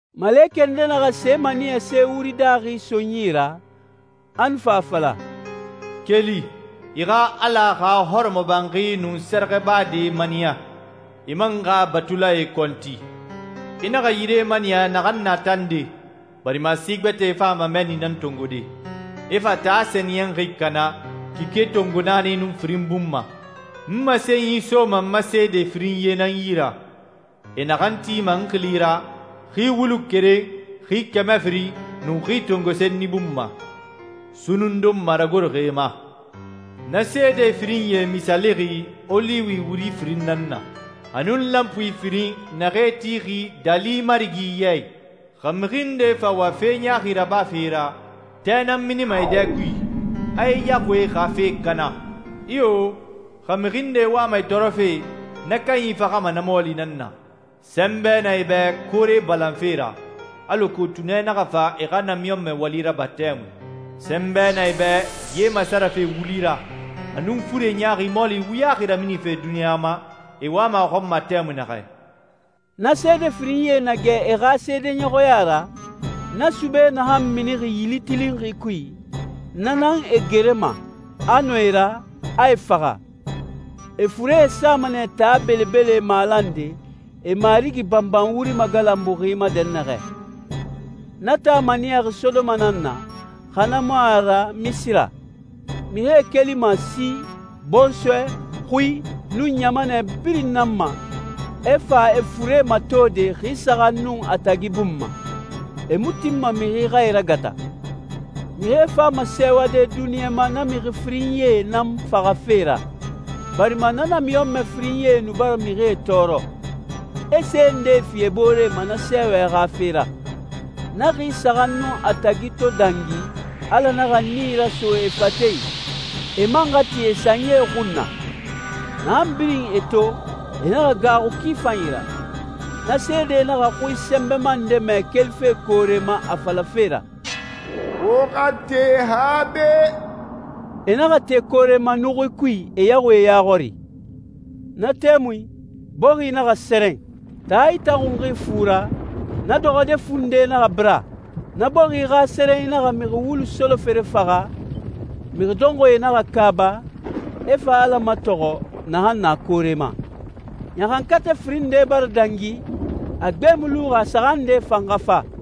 Malekɛ nde naxa se maniyase wuri daaxi so n yi ra, a nu fa a fala, «Keli, i xa Ala xa hɔrɔmɔbanxi nun sɛrɛxɛbade maniya, i man xa batulae kɔnti. I naxa yire maniya naxan na tande, barima si gbɛtɛe fama mɛnni nan tongode, e fa taa sɛniyɛnxi kana kike tongo naani nun firin bun ma. N masenyi soma n ma seede firinyie nan yi ra, e naxan tima n xili ra xi wulu keren xi kɛmɛ firin nun xi tongo senni bun ma, sunnun donma ragoroxi e ma. Na seede firinyie misaalixi oliwi wuri firin nan na, a nun lanpui firin naxee tixi Daali Marigi ya i. Xa mixi nde fa wa fe ɲaaxi rabafe e ra, tɛ nan minima e dɛ kui, a e yaxuie xa fe kana. Iyo, xa mixi nde wama e tɔɔrɔfe, na kanyi faxama na mɔɔli nan na. Sɛnbɛ na e bɛ koore balanfe ra, alako tunɛ naxa fa e xa namiɲɔnmɛ wali raba tɛmui. Sɛnbɛ na e bɛ ye masarafe wuli ra, a nun fure ɲaaxi mɔɔli wuyaxi raminife duniɲa ma e wama a xɔn ma tɛmui naxɛ.» Na seede firinyie na gɛ e xa seedeɲɔxɔya ra, na sube naxan minixi yili tilinxi kui, na nan e gerema, a nɔ e ra, a e faxa. E furee sama nɛ taa belebele malande, e Marigi banban wuri magalanbuxi ma dɛnnaxɛ. Na taa maniyaxi Sodoma nan na, xa na mu a ra Misira. Mixie kelima si, bɔnsɔɛ, xui, nun ɲamanɛ birin nan ma, e fa e fure matode xi saxan nun a tagi bun ma. E mu tinma mixi xa e ragata. Mixie fama sɛɛwade duniɲa ma na mixi firinyie nan faxafe ra, barima na namiɲɔnmɛ firinyie nu bara mixie tɔɔrɔ. E se ndee fi e booree ma na sɛɛwɛ xa fe ra. Na xi saxan nun a tagi to dangi, Ala naxa nii raso e fate, e man xa ti e sanyie xun na. Naxan birin e to, e naxa gaaxu ki fanyi ra. Na seedee naxa xui sɛnbɛma nde mɛ kelife koore ma a falafe ra, «Wo xa te han be.» E naxa te koore ma nuxui kui e yaxuie ya xɔri. Na tɛmui, bɔxi naxa sɛrɛn. Taa itaxunxi fu ra, na dɔxɔde fu nde naxa bira. Na bɔxi xa sɛrɛnyi naxa mixi wulu solofere faxa, mixi dɔnxɔɛe naxa kaaba, e fa Ala matɔxɔ, naxan na koore ma. Ɲaxankatɛ firin nde bara dangi, a gbe mu luxi a saxan nde fan xa fa.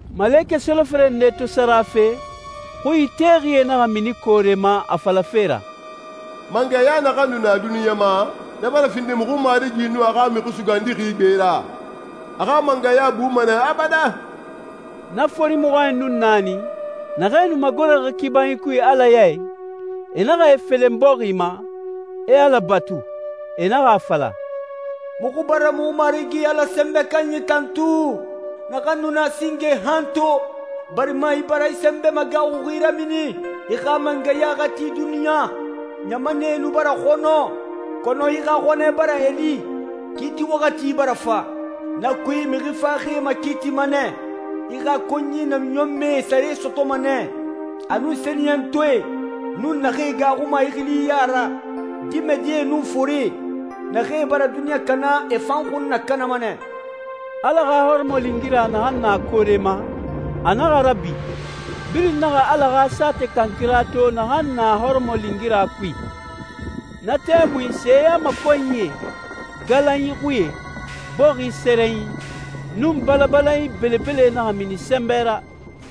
Malekɛ solofere nde to sara fe, xui itexie naxa mini koore ma a falafe ra, «Mangɛya naxan nu na duniɲa ma, na bara findi muxu Marigi nun a xa Mixi Sugandixi gbe ra. A xa mangɛya buma nɛ abadan.» Na fori mɔxɔɲɛn nun naani, naxee nu magoroxi kibanyie kui Ala ya i, e naxa e felen bɔxi ma, e Ala batu. E naxa a fala, «Muxu bara muxu Marigi Ala Sɛnbɛ Kanyi tantu, naxan nu na singe han to, barima i bara i sɛnbɛ magaaxuxi ramini, i xa mangɛya xa ti duniɲa. Ɲamanɛe nu bara xɔnɔ, kɔnɔ i xa xɔnɛ bara e li, kiiti waxati bara fa. Na kui, mixi faxaxie makiitima nɛ, i xa konyi namiɲɔnmɛe e sare sɔtɔma nɛ, a nun sɛniyɛntɔɛe, nun naxee gaaxuma i xili ya ra, dimɛdie nun forie. Naxee bara duniɲa kana, e fan xun nakanama nɛ.» Ala xa hɔrɔmɔlingira naxan na koore ma, a naxa rabi, birin naxa Ala xa saatɛ kankira to naxan na hɔrɔmɔlingira kui. Na tɛmui seyamakɔnyie, galanyi xuie, bɔxi sɛrɛnyi, nun balabalanyi belebele naxa mini sɛnbɛ ra.